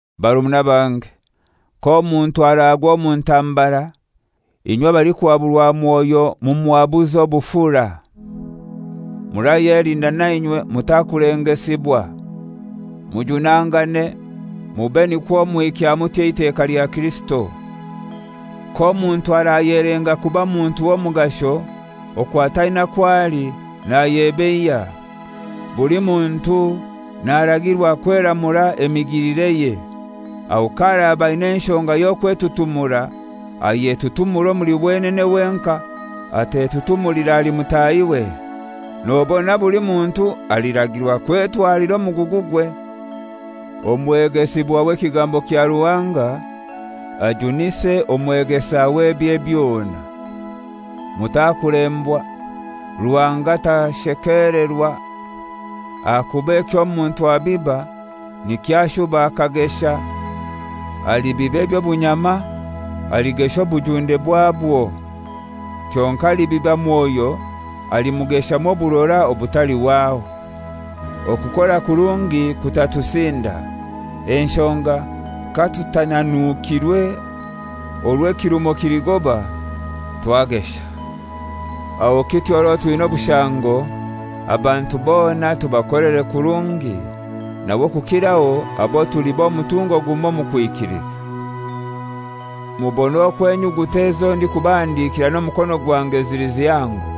Barumuna bange, k'omuntu aragwa omu ntambara, inywe abalikuhaburwa Mwoyo mumuhabuze obufura. Murayelinda nainywe mutakulengesibwa. Mujunangane, mube nikwo muhikya mutyo eiteka lya Kirisito. K'omuntu arayelenga kuba muntu w'omugasho, okwo ataina kwo ali, nayebeiya. Buli muntu naragirwa kweramura emigilireye, aho k'araba aina enshonga y'okwetutumura ayetutumure omuli wenene wenkai, atetutumulira ahali mutahiwe. Nobona buli muntu aliragirwa kwetwalira omugugugwe. Omwegesibwa w'ekigambo kya Ruhanga ajunise omwegesawe ebye byona. Mutakulembwa; Ruhanga tashekelerwa, ahakuba eky'omuntu abiba nikyo ashuba akagesha. Alibiba eby'obunyama aligesha obujunde bwabwo. Kyonkai alibiba Mwoyo alimugeshamu oburora obutalihwaho. Okukora kurungi kutatusinda, enshoga katutananuukirwe orwo ekirumo kiligoba twagesha. Aho kityo orwo twina obushango, abantu bona tubakolere kurungi, nawe okukiraho abo tuli b'omutungo gumoi omu kwikiliza. Mubone okwo enyuguta ezo ndikubahandikira n'omukono gwange zili zihango.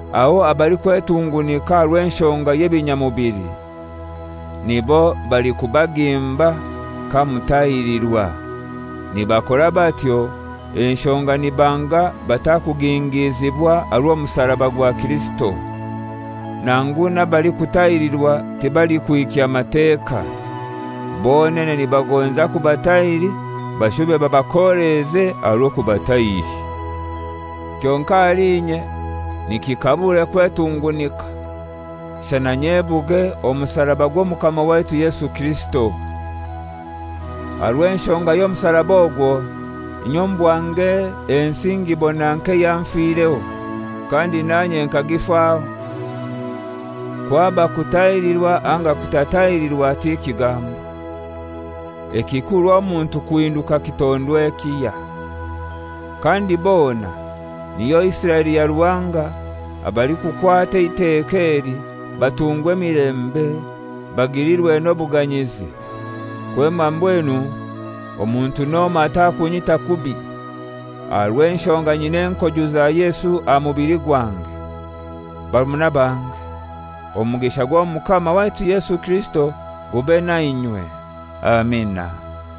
Aho abalikwetungunika aha rw'enshonga y'ebinyamubili nibo balikubagimba kamutahirirwa, nibakora batyo enshonga nibanga batakugingizibwa aha rw'omusaraba gwa Kirisito. Nangu n'abalikutahirirwa tibalikuhikya Mateka. Bonene nibagonza kubatahiri bashube babakoleeze aha rw'okubatahiri. Kyonkai ahali inye nikikabure kwetungunika, shana nyebuge omusaraba gw'Omukama waitu Yesu Kirisito. Aha rw'enshonga y'omusaraba ogwo, inye omu bwange ensi ngibona nk'eyanfireho, kandi nanye nkagifaho. Kwaba kutahirirwa anga kutatahirirwa ti kigambo. Ekikuru omuntu kuhinduka kitondwa ekihya. Kandi bona, niyo Isiraeli ya Ruhanga, abalikukwata eiteka eli, batungwe emilembe, bagilirwe n'obuganyizi. Kwema mbwenu omuntu n'omoi atakunyita kubi; aha rw'enshonga nyina enkoju za Yesu aha mubili gwange. Barumuna bange, omugisha gw'Omukama waitu Yesu Kirisito gube nainywe. Amina.